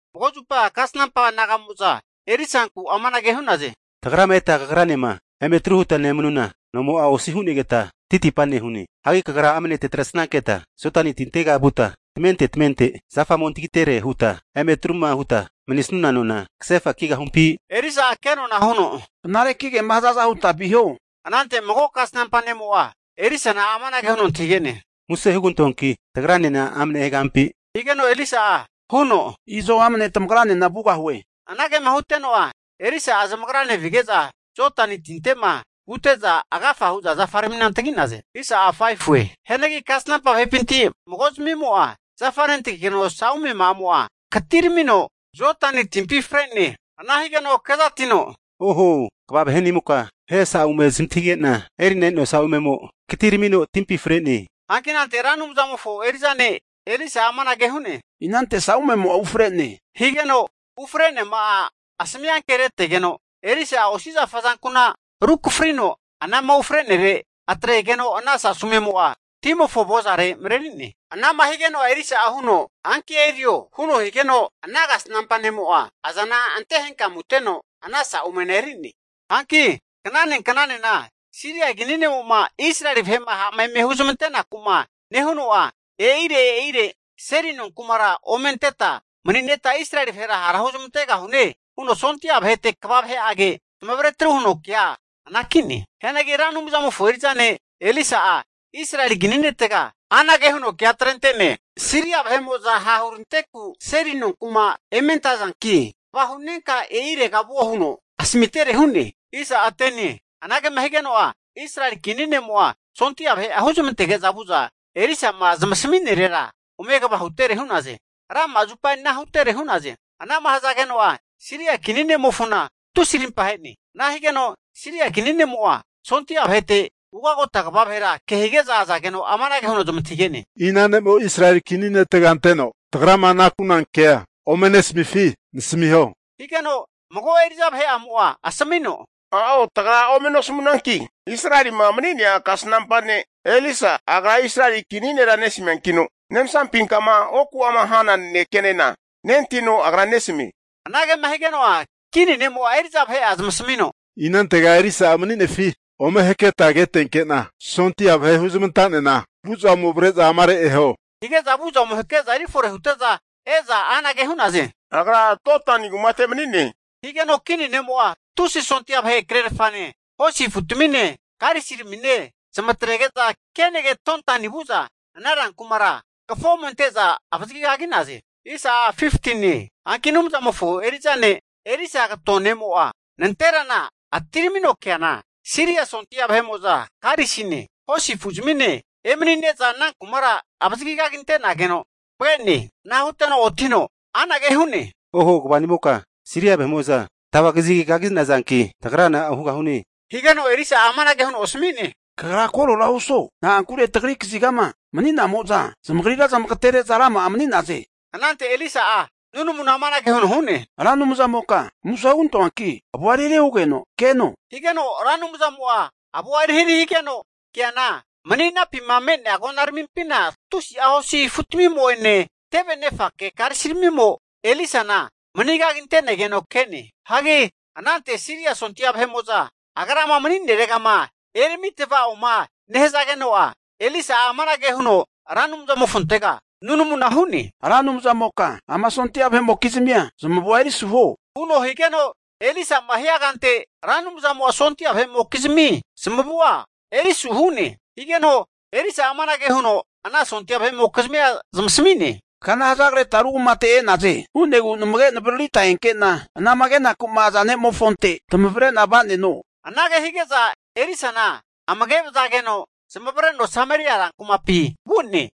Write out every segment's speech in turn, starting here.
Mago zupa kasnampa naga'moza Elisanku amanage hu'naze, Tagrama eta kagranema eme atru huta nemanuna nomo'a osi hu'negeta titipa nehune. Hagi kagra amne tatresanketa Jodani tintega vuta tamente tamente zafa ome antagitere huta, eme atruma huta manisuna nona kasefa kigahumpi? Hazageno Elisa'a kenona huno, Knareki kema hazaza huta viho. Anante mago kasnampa ne'mo'a Elisana amanage huno antahige'ne, Muse hugantoanki tagranena amne egahampi? Higeno Elisa'a huno, Izo amane tamagranena vugahue. Anagema huteno'a Elisa'a zamagrane vige'za, Jodani tinte'ma vute'za, agafa hu'za zafaramina antagi'naze. Hianagi kasnampa vahe'pinti mago'zamimo'a zafa nentagigeno sa'ume'amo'a katiramino Jodani timpi fre'ne. Ana higeno kezatino, Oho, kva vahe'nimoka, vahe sau'me zamantahige'na eri'na e'noa saumemo katiramino timpi fre'ne. Hanki anante Ra Anumzamofo eri'za ne' Elisa'a amanage hu'ne, Inante saumemo'a ufre'ne, higeno ufre'neama'a asami ankeretegeno, Elisa'a osi zafa azanku'na rukafrino anama ufrenere atregeno ana sasumemo'a timofo avozare mareri'ne. Anama higeno'a Elisa'a huno, Hanki erio, huno higeno ana kasnampa ne'mo'a azana ante henkamuteno ana sa'umena eri'ne. Hanki knane knanena Siria kini ne'mo'ma Israeli vahe'ma ha'ma eme huzamanteku'ma nehuno'a, e'ire e'ire seli nonkumara ome anteta mani'neta Israeli vahera hara huzmantegahune huno sondia vahete kva vahe'age zamavaretru huno kea anaki'ne. Hianagi Ra Anumzamofo eri'za ne' Elisa'a Israeli kini netega anage huno kea atrente'ne, Siria vahe'mo'za hahuranteku seli nonkuma eme antazanki kva hu'nenka e'irega ovuo huno asamitere hu'ne. Anagema higeno'a, Israeli kini ne'mo'a sondia vahe'a huzmantege'za vu'za Elisa'ma zamasamirera ome kva hutere hu'naze. Rama'a zupa ana hutere hu'naze. Anama nehazageno'a, Siria kini ne'mofona tusi rimpahe'ne. Ana higeno Siria kini ne'mo'a, sondia vahete ugagota kva vahera kehige'za azageno amanage huno zamantahige'ne, ina ne'mo Israeli kini netega anteno, tagrama huna kea ome nesamifi nasamiho? Higeno mago eri'za vahe'amo'a asmino, a'o tagra ome nosamunanki Israelima mani'nea kasnampa ne' Elisa agra Israeli kini nera nesamiankino, nemsampinkama oku'ama hana nanekenena nentahino agra nesamie. Anagema higeno'a, kini ne'mo'a eri'za vahe'a zamasamino, inantega Elisa'a mani'nefi ome haketa ketenke'na sondia vahe huzmanta'nena vu'za ome avre'za amare eho. Hige'za vu'za ome hake'za kefore hute'za e'za anage hu'naze, Agra Dotani kumate mani'ne. Higeno kini ne'mo'a tusi sondia vahe krerafane, hosi afutamine, karisiramine zamatrege'za kenage Dotani vu'za ana rankumara kafo ome ante'za avazagi kagi'naze. Hanki Anumzamofo eri'za ne' Elisa kato ne'mo'a nanterana atiramino keana, Siria sondia vahe'mo'za karisine, hosi afu'zmine emani'ne'za ana kumara avazigaginte'nageno zamage'ne. Ana huteno otino anage hu'ne, Oho kva vahe'nimoka, Siria vahe'mo'za tavazagi kagi'nazanki, tagra na'a hugahune? Higeno Elisa'a amanage huno asami'ne, Kagra korora osuo. Na'ankure tagri kazigama mani'namo'za zamagrira zamagatere'za rama'a mani'naze. Anante Elisa'a nunamuna amanage huno hu'ne, Ra Anumzamoka muse hugantoanki avua erihari hugeno keno, higeno Ra Anumzamo'a avua erihari higeno keana, mani'nampi me'nea agonaramimpina tusi'a hosi afutamimo'ene, tevenefake karisiramimo Elisana megaginte'negeno ke'ne. Hagi anante Siria sondia vahe'mo'za agrama mani'neregama erami tava'oma nehazageno'a, Elisa'a amanage huno Ra Anumzamofontega nunamuna hu'ne, Ra Anumzamoka ama sondia vahe'mokizmia zamavua erisu huo, huno higeno Elisa'ma hia kante, Ra Anumzamo'a sondia vahe'mokizmi zamavua erisu hu'ne. Higeno Elisa'a amanage huno ana sondia vahe'mokizmia zamasami'ne, Kana hazagreta ru kumate e'naze. Hu'negu namage navaririta enke'na anama kenaku'ma aza ne'mofonte tamavre'na va'neno. Anage hige'za Elisana amage vazageno zamavareno Sameria rankumate vu'ne.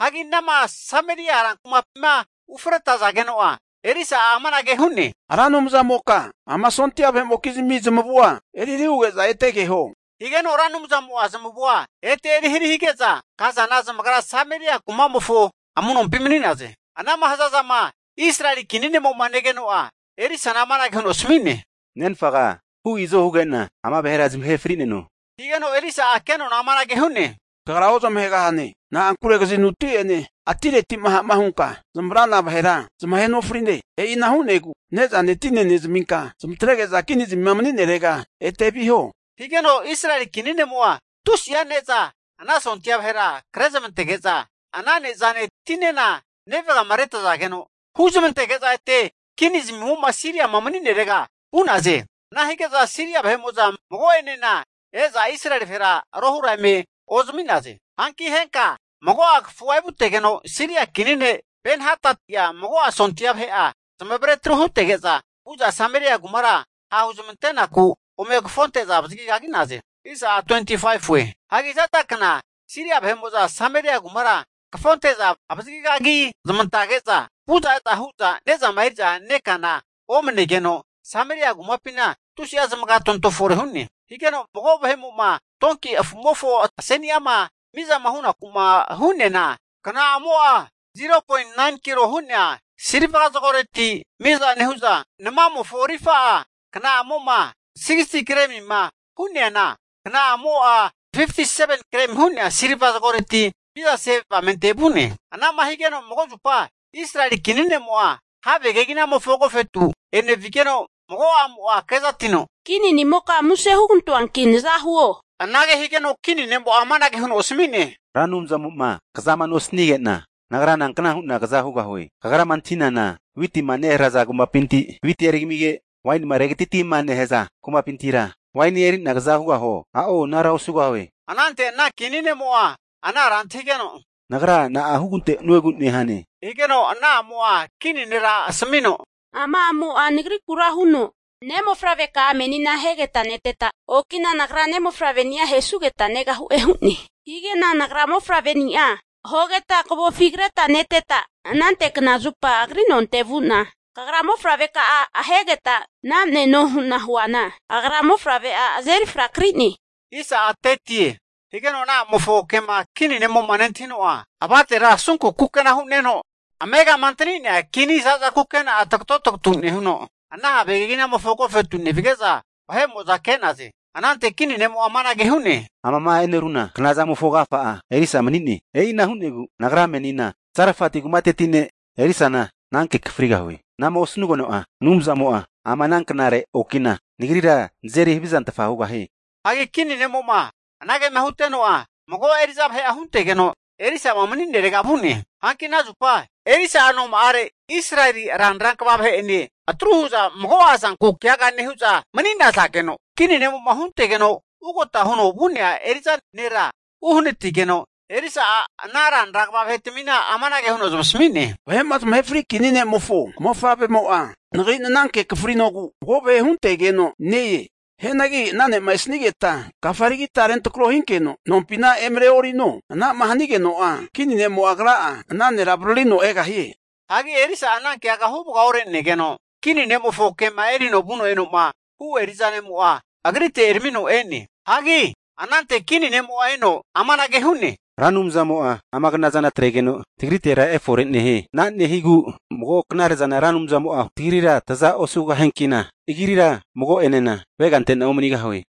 Hagi anama Sameria rankumapima ufretazageno'a, Elisa'a amanage hu'ne, Ra Anumzamoka ama sondia vahe'mokizmi zamavua erihari huge'za ete keho. Higeno Ra Anumzamo'a zamavua ete erihari hige'za kazana zamagra Sameria kumamofo amu'nompi mani'naze. Anama hazazama Israeli kini ne'mo'ma negeno'a, Elisana amanage huno asami'ne, Nenfaga hu i'zo huge'na ama vahera zamahe fri'neno? Higeno Elisa'a kenona'a amanage hu'ne, kagra ozamahegahane. Na'ankure kazinuti'ene atireti'ma ha'ma hunka zamavrana vahera, zamahe nofrine. E'ina hu'negu ne'zane tine nezaminka zamatrege'za kinizmima mani'nerega ete viho. Higeno Israeli kini ne'mo'a tusi'a ne'za ana sondia vahera krezmantage'za, ana ne'zane tinena nevagama retazageno, huzmantege'za ete kini zamimo'ma Siriama mani'nerege vu'naze. Ana hige'za Siria sondia vahe'mo'za mago'enena e'za Israeli vahera rohura eme ozami'naze. Hanki henka, mago'a kafua evutegeno, Siria kini ne' Ben-Hadati'a maka sondia vahe'a zamazeri tru hutege'za, vu'za Sameria kumara ha' huzamantenaku ome kafonte'za avazagigagi'naze. Hagi za'za kna Siria vahe'mo'za Sameria kumara kafo ante'za avazagigagi zamantazage'za, vu'za e'za hu'za ne'zama eri'za nekana omanegeno, Sameria kumapina tusi'a zamagatontoza fore hu'ne. Higeno mago vahe'mo'ma tonki afu'mofo aseni'ama mizama hu'naku'ma hu'neana, kna'amo'a 0.9kilo hu'nea silva zagoreti miza nehu'za, namamofo rifa'a kna'amo'ma 63gremi hu'neana, kna'amo'a 57gremi hu'nea silva zagoreti mizase avamente vu'ne. Ana'ma higeno mago zupa Israeli kini ne'mo'a have keginamofo agofetu enevigeno mago a'mo'a kezatino, kini'nimoka muse hugantoanki, naza huo. Anage higeno kini ne'mo'a amanage huno asmi'ne, Ra Anumzamo'ma kazama nosanige'na, nagra nankna hu'na kaza hugahue? Kagrama antahinana witima neharaza kumapinti witia eri kamige, wainima regatatima nehaza kumapintira wainia eri'na kaza hugahuo? A'o anara osugahue. Anante ana kini ne'mo'a ana ara antahigeno, Nagra na'a hugante'nuegu nehane? Higeno ana a'mo'a kini nera asmino, Ama a'mo'a nagriku huno, ne'mofavreka'a menina ahegeta neteta, okina nagra ne'mofavreni'a ahesugeta negahu'e hu'ne. Hige'na nagra mofavre'ni'a ahogeta kavofi kreta neteta, anante knazupa agri nonte vu'na, kagra mofavre'ka'a ahegeta na'mneno hu'na huana, agra mofavre'a azeri fraki'ne. Higeno ana a'mofo kema kini ne'mo'ma nentahino'a, avatera asunku kukena hu'neno, amegama antani'nea kini zaza kukena'a tagato tugutu nehuno, ana have keginamofo agofetu nevige'za, ke'naze. Anante kini ne'mo'a amanage hu'ne, Amama e'neruna knazamofo agafa'a Elisa mani'ne. E'ina hu'negu nagra menina Sarafati kumateti ne' Elisana ananke akafrigahue. Ana'ma osanugeno'a, Anumzamo'a ama ana knare okina nagrira nazeri havizantfa hugahie. Hagi kini ne'mo'ma anagema huteno'a, mago eri'za vahe huntegeno Elisa'ma mani'nerega vu'ne. Hanki ana zupa Elisa'a noma'afi Israeli ranra kva vahe'ene atru hu'za mago'a zanku keaga nehu'za mani'nazageno, kini ne'mo'ma huntegeno ugota huno vu'nea eri'za nera uohanati'negeno, Elisa'a ana ranra kva vahetamina amanage huno zamasami'ne, Vahe'ma zamahe fri kini ne'mofo mofavremo'a, nagri nananke akafrinogu mago vahe huntegeno ne-e. Hianagi ana ne'ma esanigeta, kafa erigita rentrako hinkeno, nompina emareorino. Anama hanageno'a, kini ne'mo'a agra'a ana nera avaririno egahie. Hagi Elisa'a ana keaga huvaga orenegeno, kini ne'mofo kema erino vuno e'noma hu eri'za ne'mo'a agrite eramino e'ne. Hagi anante kini ne'mo'enena eno amanage hu'ne, Ra Anumzamo'a ama knazana atregeno tagritera efore nehie. Ana nehigu mago knare'zana Ra Anumzamo'a tagrira taza osugahiankina agrira mago'enena avegante'na omanigahue.